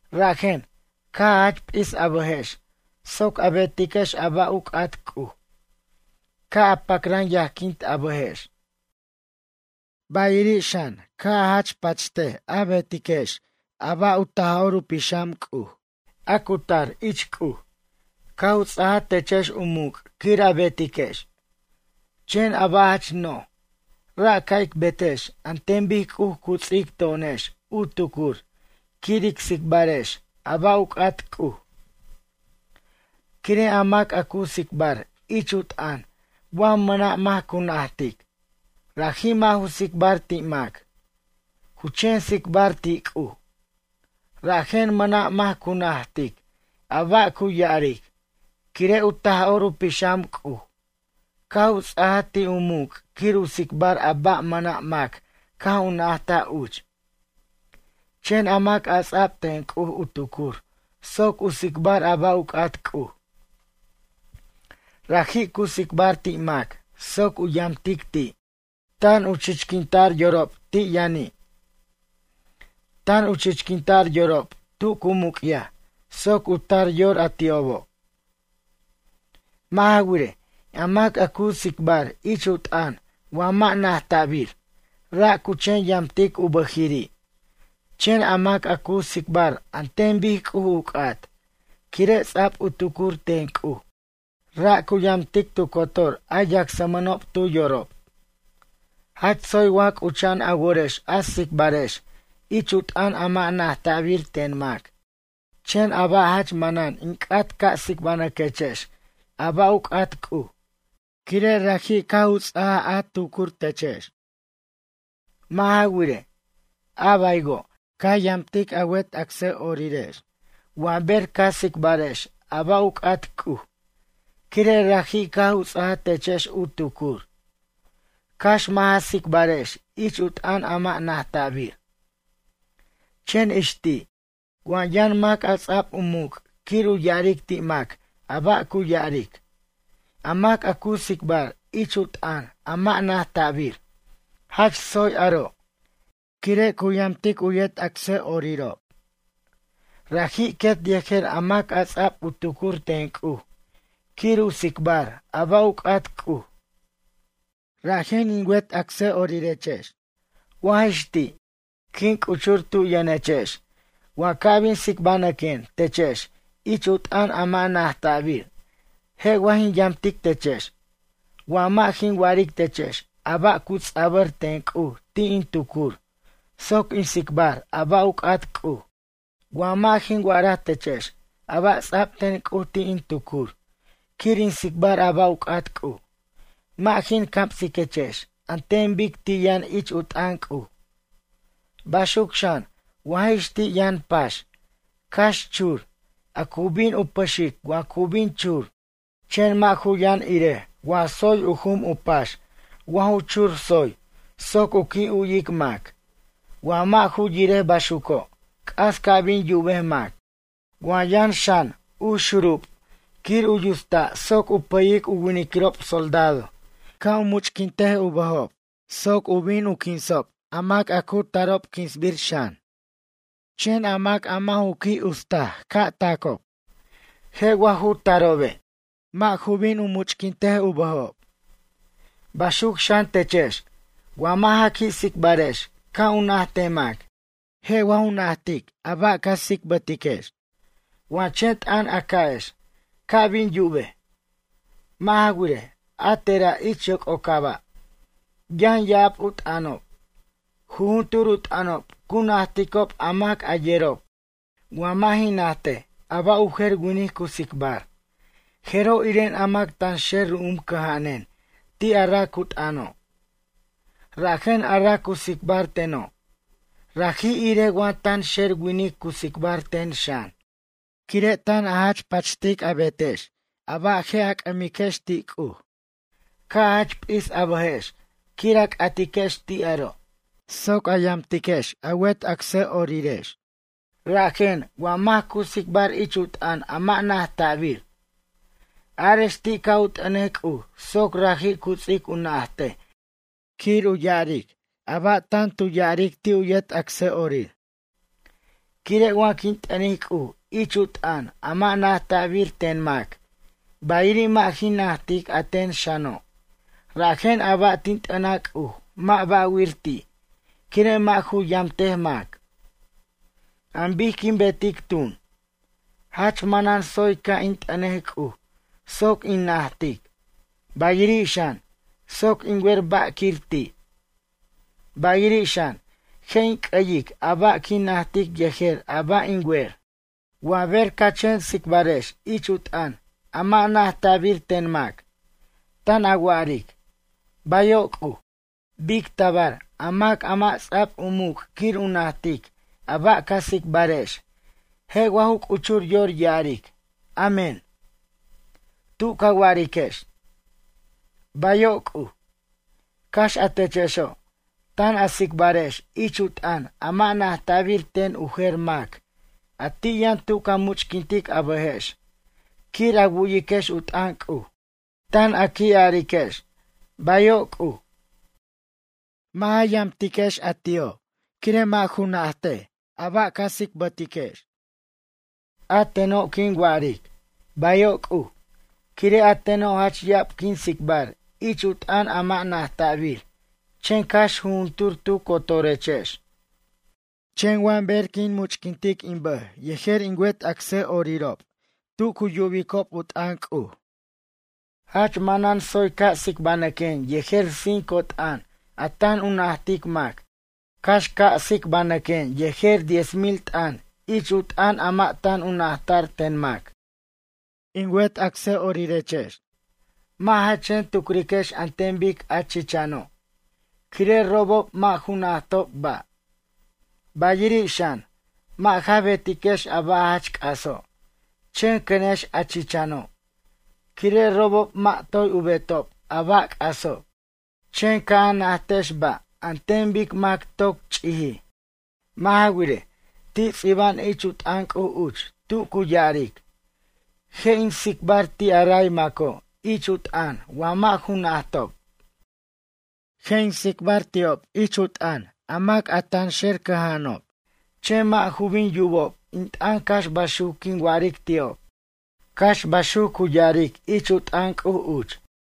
Rajen, caj a jach p'is a bʌjex soc a betiquex a ba' u c'at C'uj. Ca' a pacran yajquint a bʌjex. Bayiri' xan, ca' a jach pacht a betiquex a ba' u Taj'or u Pixam C'uj, a cu tar ich C'uj, caj u ts'ajaj techex u muc' quir a betiquex. Chen a ba' jach noj, ra' ca' ic betex an ten bic C'uj cu ts'ic to'onex u tucur quir ic tsicbarex a ba' u c'at C'uj. Quire' a mac a cu tsicbar ich u t'ʌn wa mʌna' mac cu najtic, raji' mʌ' ju tsicbar ti' mac, cu chen tsicbar ti' C'uj. Rajen mʌna' mac cu najtic a ba' cu ya'aric, quire' u Taj'or u Pixam C'uj caj u ts'ajaj ti' u muc' quir u tsicbar a ba' mʌna' mac caj u najtaj uch. Chen a mac a ts'ab ten C'uj u tucur soc u tsicbar a ba' u c'at C'uj. Raji' cu tsicbar ti' mac soc u yamtic ti', tan u chichquinta'r yorob ti' yʌni'. Tan u chichquinta'r yorob tu cu muc'yaj soc u tar u yor a ti'obo'. Mʌ' ja wirej, a mac a cu tsicbar ich u t'ʌn wa mʌ' najta'bir, ra' cu chen yamtic u bʌjiriri', chen a mac a cu tsicbar an ten bic C'uj u c'at, quire' ts'a'b u tucur ten C'uj, ra' cu yamtic tu cotor a yacsmʌnob tu yorob. Jach tsoy wa c'ucha'an a worex a tsicbarex ich u t'ʌn a mʌ' najta'bir ten mac, chen a ba' jach manan in c'at ca' tsibanʌquechex a ba' u c'at C'uj, quire' raji' caj u ts'aj u tucur techex. Mʌ' ja wirej, a baywo', ca yamtic a wet acsa'orirex wa ber ca tsicbarex a ba' u c'at C'uj, quire' raji' caj u ts'ajaj techex u tucur. Cax mʌ' ja tsicbarex ich u t'ʌn a mʌ' najta'bir. Chen ix ti', wa yʌn mac a ts'ab u muc' quir u ya'aric ti' mac a ba' cu ya'aric, a mac a cu tsicbar ich u t'ʌn a mʌ' najta'bir, jach tsoy aro', quire' cu yamtic u yet acsa'orirob. Raji' quet yejer a mac a ts'a'b u tucur ten C'uj quir u tsicbar a ba' u c'at C'uj. Rajen in wet acsa'orirex, wa jix ti', quin c'uchur tu' yʌnechex wa ca' bin tsicbanʌquen techex ich u t'ʌn a mʌ' najta'bir, je' wa jin yamtic techex wa mʌ' jin wa'aric techex a ba' cu ts'abʌr ten C'uj ti' in tucur soc in tsicbar a ba' u c'at C'uj? Wa mʌ' jin wa'araj techex a ba' ts'a'b ten C'uj ti' in tucur quir in tsicbar a ba' u c'at C'uj, mʌ' jin camsiquechex an ten bic ti' yʌn ich u t'ʌn C'uj. Baxuc xan, wa jix ti' yʌn pax, cax chur, a cu bin u pʌxic wa cu bin chur, chen mʌ' ju yʌn irej wa tsoy u jum u pax wa ju chur tsoy soc u qui' yuwic mac, wa mʌ' ju yirej baxuco', c'as cu bin yubej mac. Wa yʌn xan, u xurub quir u yusta' soc u pʌyic u winiquirob soldado ca' u much'quint u bʌjob soc u bin u quinsob a mac a cu tarob quinsbir xan. Chen a mac a mʌ' ju qui' ustaj ca' tacob, je' wa ju tarobe'? Mʌ' ju bin u much'quint u bʌjob. Baxuc xan techex, wa mʌ' ja qui' tsicbarex ca' u najtej mac, je' wa ju najtej a ba' ca tsicbarex? Wa chen t'ʌn a ca'ex ca' bin yubej. Mʌ' ja wirej, a tera' ich yoc'ocaba', yʌn ya'ab u t'ʌnob. Jujuntur u t'ʌnob cu najticob a mac a yerob. Wa mʌ' jin najtej a ba' u jer winic cu tsicbar, jeroj iren a mac tanxer ru'um cʌja'anen ti' a ra' cu t'ʌno'. Rajen a ra' cu tsicbar teno', raji' irej wa tanxer winic cu tsicbar ten xan. Quire' tan a jach pacht a betex a ba' a je' a c'ʌmiquex ti' C'uj, ca' a jach p'is a bʌjex quir a c'atiquex ti' aro', soc a yamtiquex a wet acsa'orirex. Rajen, wa mac cu tsicbar ich u t'ʌn a mʌ' najta'bir. Arex ti' ca' u t'ʌnej C'uj soc raji' cu ts'ic u najtej quir u ya'aric a ba' tan tu ya'aric ti' yet acsa'orir. Quire' wa quin t'ʌnic C'uj ich u t'ʌn a mʌ' najta'bir ten mac, bayiri' mʌ' jin najtic a ten xano', rajen a ba' tin t'ʌnaj C'uj mʌ' ba'wir ti', quire' mʌ' ju yamtej mac. An bic quin betic tun? Jach manan tsoy ca' in t'ʌnej C'uj soc in najtic, bayiri' xan, soc in wer ba' quir ti'. Bayiri' xan, je' in c'ayic a ba' quin najtic yejer a ba' in wer. Wa ber ca chen tsicbarex ich u t'ʌn a mʌ' najta'bir ten mac, tan a wa'aric: “Bayo' C'uj.” Bic tabar a mac a mʌ' ts'a'b u muc' quir u najt a ba' ca tsicbarex je' wa ju c'uchur yor ya'aric: “Amén”, tu ca wa'ariquex: “Bayo' C'uj”? Cax a techexo', tan a tsicbarex ich u t'ʌn a mʌ' najta'bir ten u jer mac a ti' yʌn tu ca much'quint a bʌjex quir a wu'yiquex u t'ʌn C'uj. Tan a qui' ariquex “Bayo' C'uj.” Mʌ' ja yamtiquex a ti'o' quire' mʌ' ju najt a ba' ca tsicbarex. A teno' quin wa'aric: “Bayo' C'uj”, quire' a teno' jach ya'ab quin tsicbar ich u t'ʌn a mʌ' najta'bir chen cax jujuntur tu cotorechex. Chen wa ber quin much'quintic in bʌj yejer in wet acsa'orirob tu cu yubicob u t'ʌn C'uj. Jach manan tsoy ca' tsicbanʌquen yejer cinco t'ʌn a tan u najtic mac, cax ca' tsicbanʌquen yejer diez mil t'ʌn ich u t'ʌn a mʌ' tan u najta'r ten mac. In wet acsa'orirex, mʌ' ja chen tucriquex an ten bic a chichano', quire' robob mʌ' ju najtob ba'. Bayiri' xan, mʌ' ja betiquex a ba' jach c'aso', chen cʌnex a chichano', quire' robob mʌ' toy u betob a ba' c'aso'. Chen ca' a najtex ba' an ten bic mac toc ch'ijij. Mʌ' ja wirej, ti' ts'iba'an ich u t'ʌn C'uj uch tu cu ya'aric: “Je' in tsicbar ti' a ray maco' ich u t'ʌn wa mʌ' ju najtob. Je' in tsicbar ti'ob ich u t'ʌn a mac a tanxer cʌja'anob, chen mʌ' ju bin yubob in t'ʌn cax baxuc quin wa'aric ti'ob.” Cax baxuc cu ya'aric ich u t'ʌn C'uj uch.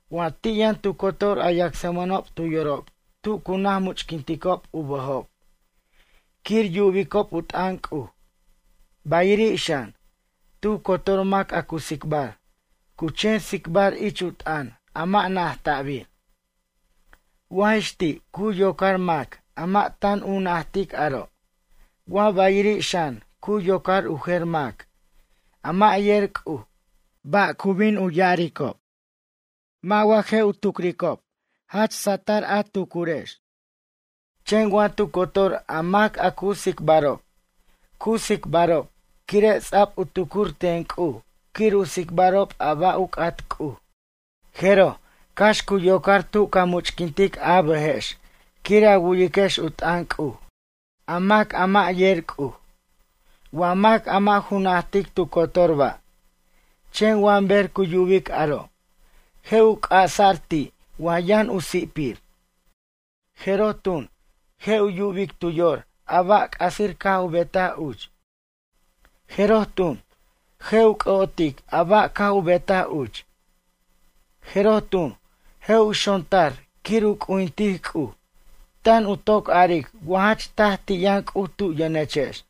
Wa ti' yʌn tu cotor a yacsmʌnob tu yorob tu cu naj much'quinticob u bʌjob quir yubicob u t'ʌn C'uj, bayiri' xan, tu cotor mac a cu tsicbar, cu chen tsicbar ich u t'ʌn a mʌ' najta'bir. Wa jix ti' cu yocar mac a mʌ' tan u najtic aro', wa bayiri' xan cu yocar u jer mac, a mʌ' yer C'uj, ba' cu bin u ya'aricob? Mʌ' wa, je' u tucricob jach rocochʌjechex? Chen wa tu cotor a mac a cu tsicbarob, cu tsicbarob quire' ts'a'b u tucur ten C'uj quir u tsicbarob a ba' u c'at C'uj. Jeroj cax cu yocar tu ca much'quint a bʌjex quir a wu'yiquex u t'ʌn C'uj a mac a mʌ' yer C'uj, wa mac a mʌ' ju najtic tu cotor ba'. Chen wa ber cu yubic aro', je' u c'asa'r ti' wa yʌn u si'pir. Jeroj tun, je' u yubic tu yor a ba' c'asir caj u betaj uch. Jeroj tun, je' u c'ʌ'otic a ba' caj u betaj uch. Jeroj tun, je' u xontar quir u c'ujintic C'uj, tan u toc aric wa jach taj ti' yʌn C'uj tu yʌnechex.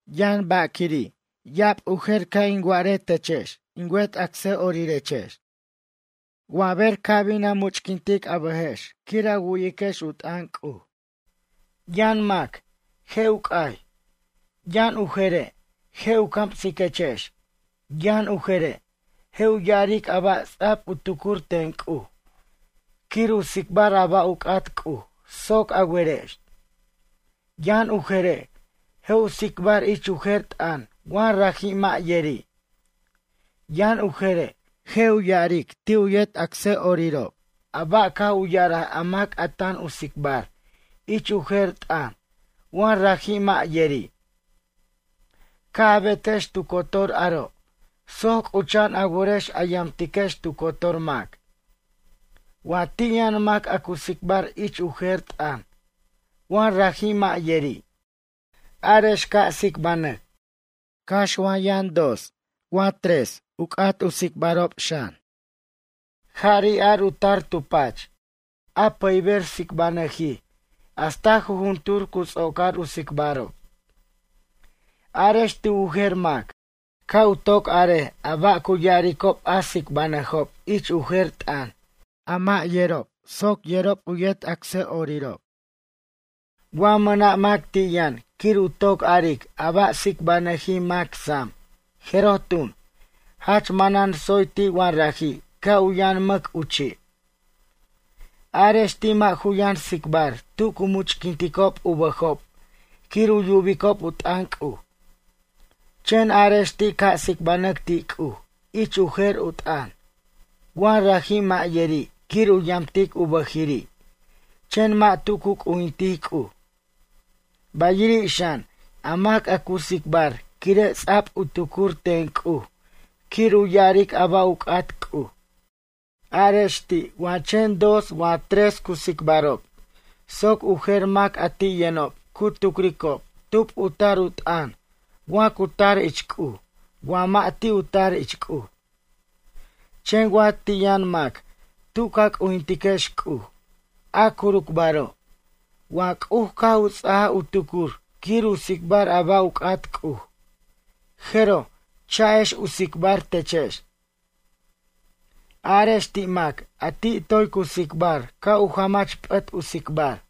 Yʌn ba' quiri' ya'ab u jer ca' in wa'aretechex in wet acsa'orirex. Wa ber ca' bin a much'quint a bʌjex quir a wu'yiquex u t'ʌn C'uj, yʌn mac, je' u c'ay, yʌn u jere' je' u camsiquechex, yʌn u jere', je' u ya'aric a ba' ts'a'b u tucur ten C'uj quir u tsicbar a ba' u c'at C'uj soc a werex. Yʌn u jere', je' u tsicbar ich u jer t'ʌn wa raji' mʌ' yeri'. Yʌn u jere', je' u ya'aric ti' u yet acsa'orirob a ba' caj u ya'araj a mac a tan tu tsicbar ich u jer t'ʌn wa raji' mʌ' yeri'. Ca' a betex tu cotor aro' soc c'ucha'an a worex a yamtiquex tu cotor mac. Wa ti' yʌn mac a cu tsicbar ich u jer t'ʌn wa raji' mʌ' yeri', arex ca' tsicbanʌc, cax wa yʌn dos wa tres u c'at u tsicbarob xan. Jari' ar u tar tu pach a pʌyber tsicbanʌjij hasta jujuntur cu ts'ocar u tsicbarob. Arex ti' u jer mac, ca' u toc arej ba' cu ya'aricob a tsicbanʌjob ich u jer t'ʌn, a mʌ' yerob soc yerob u yet acsa'orirob. Wa mʌna' mac ti' yʌn quir u toc aric a ba' tsicbajnʌjij mac sam, jeroj tun, jach manan tsoy ti' wa raji' ca' u yʌn mʌc u chi'. Arex ti' mʌ' ju yʌn tsicbar tu cu much'quinticob u bʌjob quir u yubicob u t'ʌn C'uj, chen arex ti' ca' tsicbanʌc ti' C'uj ich u jer u t'ʌn, wa raji' mʌ' yeri' quir u yamtic u bʌjiri', chen mʌ' tu cu c'ujintic C'uj. Bayiri' xan, a mac a cu tsicbar quire' ts'a'b u tucur ten C'uj quir u ya'aric a ba' u c'at C'uj. Arex ti' wa chen dos wa tres cu tsicbarob soc u jer mac a ti' yʌnob cu tucricob tub u tar u t'ʌn wa cu tar ich C'uj wa mʌ' ti' u tar ich C'uj. Chen wa ti' yʌn mac tu ca c'ujtinquex C'uj, a curucbaro', wa C'uj caj u ts'ajaj u tucur quir u tsicbar a ba' u c'at C'uj, jeroj cha'ex u tsicbar techex. Arex ti' mac a ti' toy cu tsicbar ca' u jamach p'ʌt u tsicbar.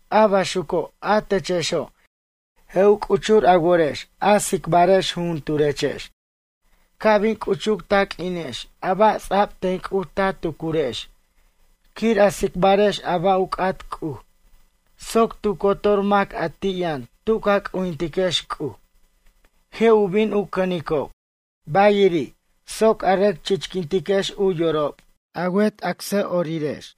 A baxuco', a techexo', je' u c'uchur a worex a tsicbarex jujunturechex, ca' bin c'uchuc ta q'uinex a ba' ts'a'b ten C'uj ta tucurex quir a tsicbarex a ba' u c'at C'uj soc tu cotor mac a ti' yʌn tu ca c'ujintiquex C'uj je' u bin u cʌnicob. Bayiri', soc a rʌc chichquintiquex u yorob a wet acsa'orirex.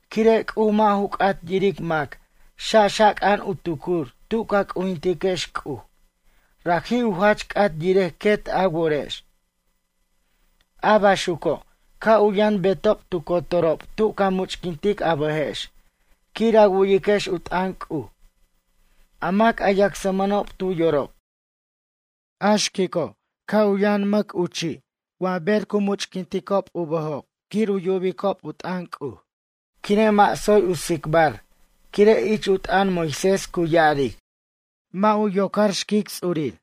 Quire' C'uj mʌ' ju c'at yiric mac xaxaca'an u tucur tu ca c'ujintiquex C'uj, raji' u jach c'at yirej quet a worex. A baxuco', ca' u yʌn betob tu cotorob tu ca much'quint a bʌjex quir a wu'yiquex u t'ʌn C'uj, a mac a yacsmʌnob tu yorob. A xquico', ca' u yʌn mʌc u chi' wa ber cu much'quinticob u bʌjob quir u yubicob u t'ʌn C'uj, quire' mʌ' tsoy u tsicbar quire' ich u t'ʌn Moisés cu ya'aric: “Mʌ' ju ocar xquic ts'urir.”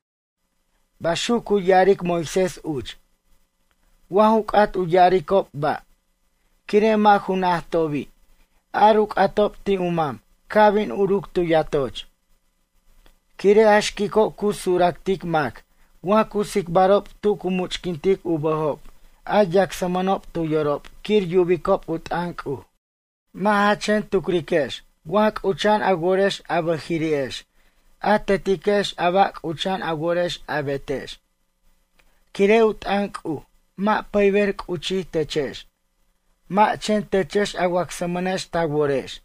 Baxuc cu ya'aric Moisés uch. Wa ju c'at u ya'aricob ba', quire' mʌ' ju najtobi', ar u c'atob ti' u mam ca' bin uruc tu yatoch. Quire' a xquico' cu suractic mac wa cu tsicbarob tu cu much'quint u bʌjob a yacsmʌnob tu yorob quir yubicob u t'ʌn C'uj. Mʌ' ja chen tucriquex wa c'ucha'an a worex a bʌjiriri'ex a tetiquex a ba' c'ucha'an a worex a betex. Quire' u t'ʌn C'uj mʌ' pʌyber c'uchij techex. Mʌ' chen techex a wacsmʌnex ta worex.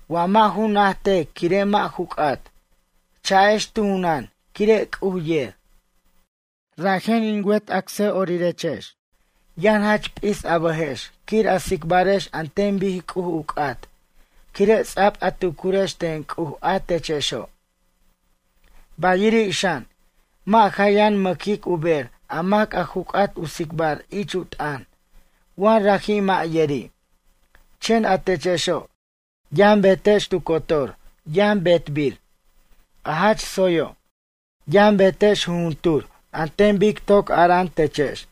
Wa mʌ' ju najtaj quire' mʌ' ju c'at, cha'ex tu junan quire' C'uj yer. Rajen in wet acsa'orirex, yʌn jach p'is a bʌjex quir a tsicbarex an ten bic C'uj u c'at quire' ts'a'b a tucurex ten C'uj a techexo'. Bayiri' xan, mʌ' ja yʌn mʌ'quic u ber a mac a ju c'at u tsicbar ich u t'ʌn wa raji' mʌ' yeri'. Chen a techexo', yʌn betex tu cotor yʌn betbir, a jach tsoyo'. Yʌn betex jujuntur an ten bic toc ara'an techex.